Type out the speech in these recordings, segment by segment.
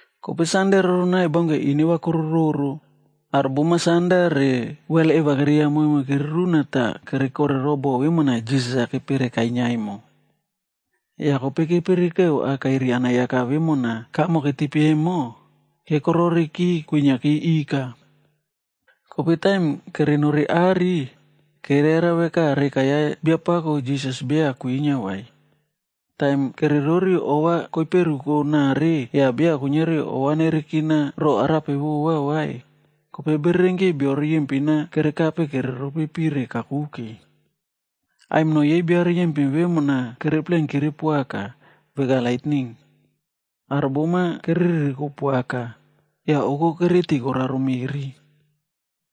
Kope sande roronai baunke ineva kororoꞌro, aro bom-a sanda re wel eva keriya momon kereruna tah kere korero bo vemona Jisas-a kepere kainia emo. Yah kope kerepirikeu akairi anayaka vemona kamo ketipe emo, kekororeki kwiniaki ika. Kope taim kere nori are, kere yara veka reka ya Biapako Jisas beya kwinia vai. Taim kere rori ova koiperuko nare yah beya kuiniari ova nerekina roꞌo arape vova vai, kope bererenki bio riyempin-a kerekape kere ropi pire kakuke. Aimino yei bia riyempin vemona kere plenkire poaka, veka laitning. Aro bom-a kere riri poaka, yah oko kereti koraro meꞌri.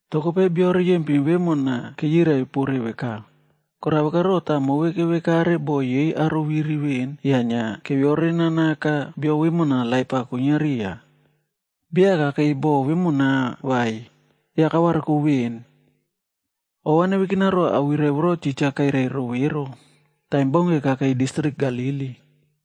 Toh kope bio riyempin vemona keyirai pore veka, “Korao vekaro tah move kevekare bo yei aro keviri veꞌen yah inia keviore nanaka bio vemo laip-a kwinia riya? Beya kakei bo vemona vai, yah kavariko veꞌen. Ova nevekina ro awirai voro titja kairai rove ero, taim baunke kakei distrik Galili.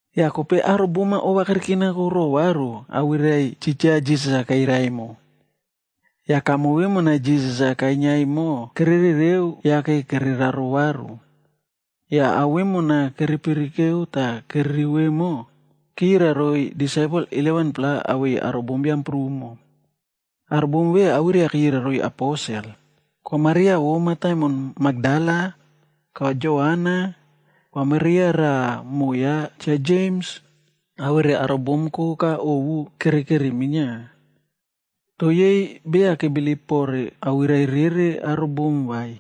Yah kope aro bom-a ova kerekinako ro varu awirai titja Jisas-a kairai emo. Yah kamo vemona Jisas-a kainia emo kere rereo yake kere raro varu. Yah ao vemona kere pirikeu tah kere rivo emo, keyirai roiy disaipel 11-pla awei aro bombiam prumo. Aro bom ve awirai-a keyirai roiy aposel, Kwa Maria vo mataimon Makdala, Kwa Joana, Kwa Maria raꞌa moꞌo ya Cha Jems, awere aro bom koka ovu kerekeri minia. Toh yei beya kebilip pore awirai rere aro bom vai.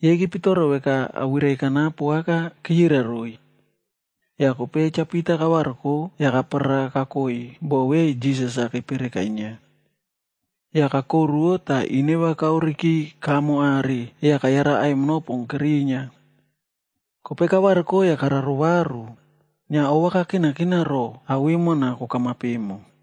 Yei kepitoro veka awirai kanapo aka keyirai roiy. Yah kope Cha Pita kavariko yah kaparara kakoi bo ve Jisas-a kepere kainia. Yah kakoruwo tah ineva kaoreki kamo are yah kayara aimino pon kerinia. Kope kavariko yah kararero varu, inia ova kakinakina roꞌo ao vemona kokamap emo.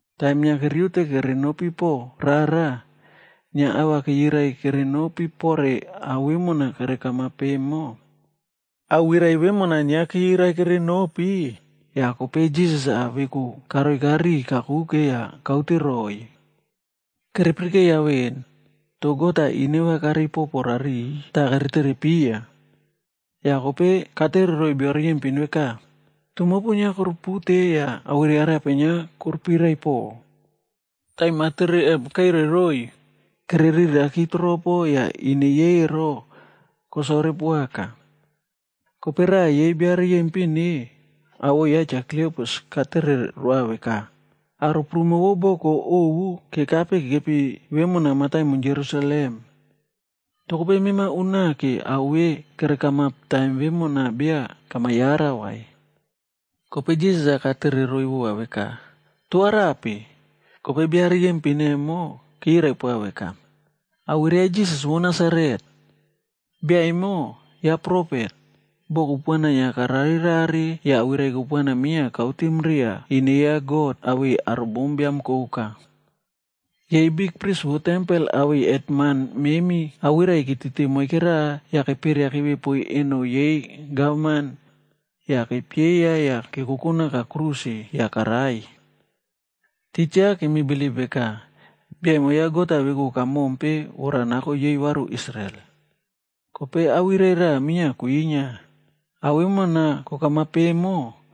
Taim inia keriute kere nopi poꞌo rara, inia ava keyirai kere nopi pore ao vemona kere kamap emo. Awirai vemona inia keyirai kere nopi, yah kope Jisas veku karoika riꞌiy kakuke yah kaute roꞌoiy. Kerepirikeya veꞌen, toh God-a ineva karei popo rariꞌiy tah kere terepiya. Yah kope katere roiy bia riyempin veka, “Toh mopu inia korupute yah awirai arape inia korupirai poꞌo?” Taim atere emo karao roiy, kere riraki toropo yah ine yei ero, kosore poaka. Kope raꞌa yei bia riyempin-e, awoꞌo ya Cha Kliopas katere roa veka, “Aro prumo vo boko ovu kekape kekepi vemona mataimon Jerusalem. Toh kope mema unake ao ve kere kamap taim vemona beya kama yara vai?” Kope Jisas-a katere roiy vova veka, “Toh arape?” Kope bia riyempin emo, keyirai poa veka, “Awirai ya Jisas vo Nasaret. Bia emo, ya profet, boꞌo kupuana inia karare rare yah awirai kupuana minia kautim riya ine ya God awei aro bombiam koka. Yei bikpris vo tempel awei hetman memi awirai ketiti moike raꞌa yah keperiakipe poiy eno yei gavman, yah kepieya yah kekoko naka kruse yah karai. Titja kemi bilip veka, bia emo ya God-a veku kamompe vora nako yei varu Israel. Kope awirai raꞌa minia kwinia, ao vemona kokamap emo,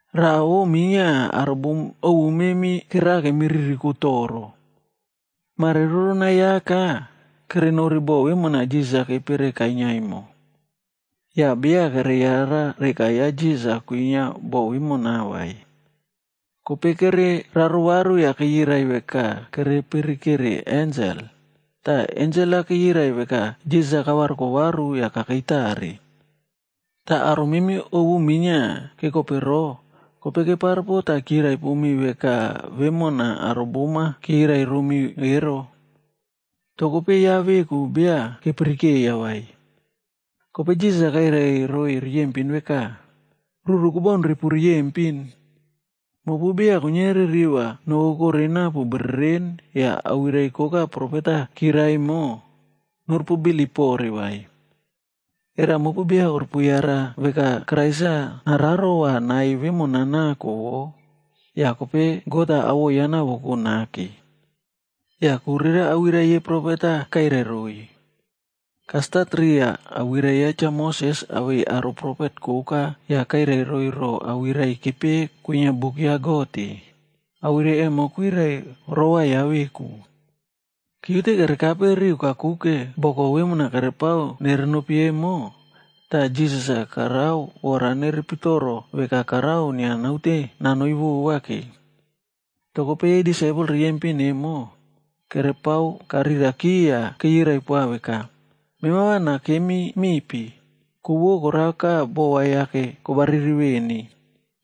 Raꞌa vo minia aro bom ovu memi kerera kemi ririkome toro. Mare roronai aka, kerenori bo vemona Jisas kepere kainia emo. Yah beya kere yara reka ya Jisas-a kwinia bo vemo vai. Kope kere rarero varu yah keyirai veka kere pirikere ensel, tah ensel-a keyirai veka Jisas-a kavariko varu yah kakei tare. Tah aro memi ovu minia kekopero, kope keparepo tah kirai pomi veka vemona aro bom-a keyirai romi ero. Toh kope ya veku beya kepirikeiya vai.” Kope Jisas-a kairai roiy riyempin veka, “Ruru kobaun repu riyempin. Mopu beya kuiniari riva nokokore napu bereren yah awirai koka profet-a kirai emo, norupu bilip pore vai. Era mopu beya korupu yara veka Krais-ac nararo va nai vemona nako wo, yah kope God-a awoꞌo ya nawoko nake?” Yah ku rere awirai yei profet-a kairai roiy. Kastat riya awirai ya Cha Moses awei aro profet koka yah kairai roiy ro awirai kepeꞌe kwinia buk ya God-e, awirai emo kwirai rova ya veku. Keriute kere kape riu kakuke boko vemona kerepao nere nopi emo, tah Jisas-a karao vora nepitoro veka karao inia naote nanoi vovake. Toh kope disaipel riyempin emo, kerepao kariraki yah keyirai poa veka, “Mema va nakemi mipi, ku vo koraka bova yake kobariri veni,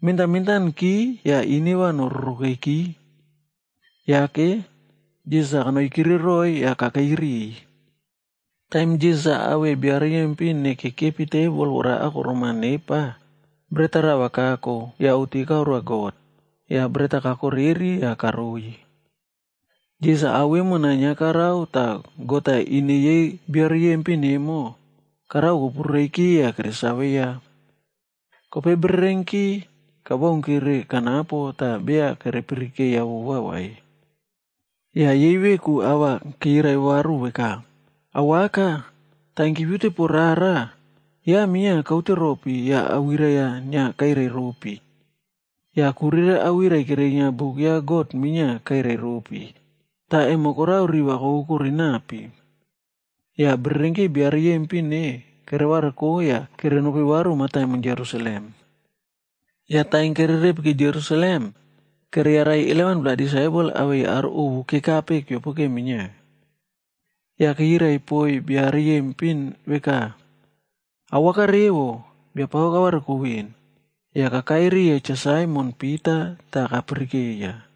mentan mentanki yah ine va nororokeki.” Yake, Jisas-a kanoikire roiy yah kakei riꞌiy. Taim Jisas awei bia riyempin-e kekepi tebol vora akorom-a nepa, bret-a rava kako yah oꞌti karoa God, yah bret-a kakoreri yah karoiy. Jisas ao vemona inia karao tah God-a ine yei bio riyempin emo, karao kopurureiki yah keresave ya. Kope bererenki, kabaunki kanapo tah beya kere pirikeiya vova vai. Yah yei veku ava keyirai varu veka, “Awaka, taim kepiute po rara, ya minia kaute ropi yah awirai-a inia kairai ropi. Yah ku rere awirai kerinia buk ya God minia kairai ropi, tah emo korao riva kokokore napi.” Yah bererenki bia riyempin-e, kere variko yah kere nopi varu mataimon Jerusalem. Yah taim kere repiki Jerusalem, kere yarai 11-pla disaipel awei aro ovu kekape keopoke minia. Yah keyirai poiy bia riyempin veka, “Awaka revo! Biapako kavariko ven, yah kakai riya Cha Saimon Pita tah kapirikeiya.”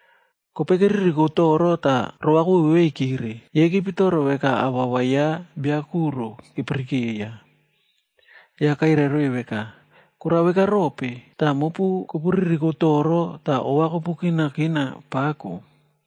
Kope keririko toro tah rova koveveveikire yah keriri. Kepitoro veka awawa ya biakuro kepirikeiya. Yah kairai roiy veka, “Korao veka rope, tah mopu kopu ririko toro tah ova kopu kinakina pako?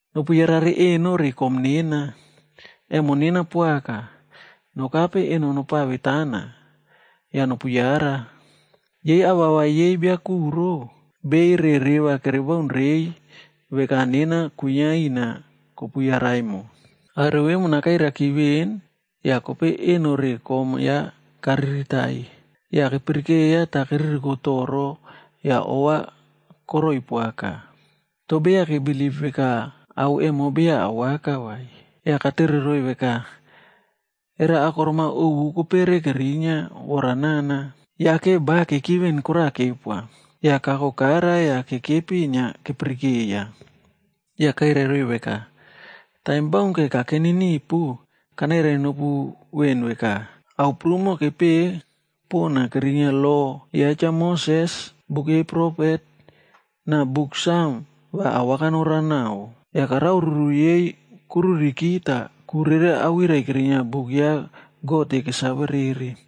Nopu yarare eno re kom nena. Emo nena poaka, nokape eno nopavetana, yah nopu yara. Yei awawa yei bia kuro, bei re reva kere baun reiy veka vemona nena kwinia ina tah kopu yara emo.” Awirai vemona kairaiki ven yah kope eno re kom ya kariritaiy. Yah kepirikeiya tah keririko toro yah ova koroi poaka. Toh beya kebilip veka ao emo awaka vai. Yah katere roiy veka, “Era akorom-a ovu kopere kerinia vora nana?” Yake ba keki ven koraꞌa kepoa, yah kako kara tah kekepi inia kepirikeiya. Yah kairai roiy veka, “Taim baunke kakeni ipu, kanairai nopu veꞌen veka, ‘ao prumo kepepeꞌe pona kerinia lo ya Cha Moses, buk yei profet, na Buk Sam va awaka nererao naꞌao.’” Yah karao ruru yei koruriki tah ku rere awirai kerinia buk ya God-e kesave rere.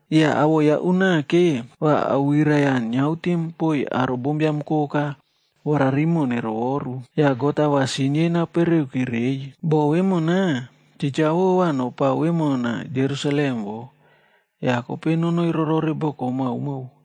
Yah awoꞌo ya unake, va awirai-a niautim poiy aro bombiam koka vora rimoꞌo nerovoru, yah God-a va sin yei napereki reiy. Boꞌo vemona, titja wo va nopao vemona Jerusalem wo, yah kope nonoi rorore boko maomao.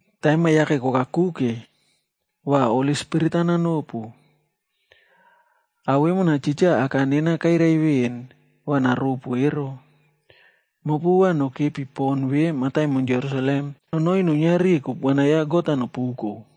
Taim-a yake kokakuke, va Holi Spirit-a nanopu. Ao vemona titja Aka nena kairai veꞌen va naropu ero. Mopu va nokepi pon ve mataimon Jerusalem nonoi nuiniari kupuana ya God-a nopuko.”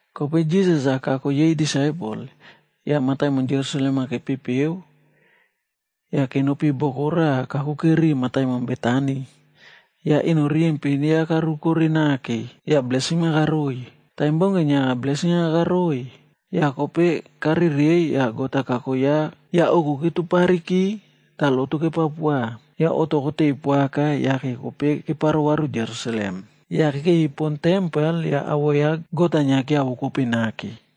Kope Jisas-a kako yei disaipel, yah mataimon Jerusalem-a kepepeu yah kenopi boko raꞌa kakuke ri mataimon Betani, yah eno riyempin ya karukore nake, Taim baunke inia blesin-a karoiy, yah kope karereiy yah God-a kako ya kakoi varu heven. Yah oku ketupariki tah lotu kepao poa, yah oꞌto koteiy poaka yake kope keparo varu Jerusalem. Yah inia kekepi pon tempel yah awoꞌo ya God-a inia kiavokope nake.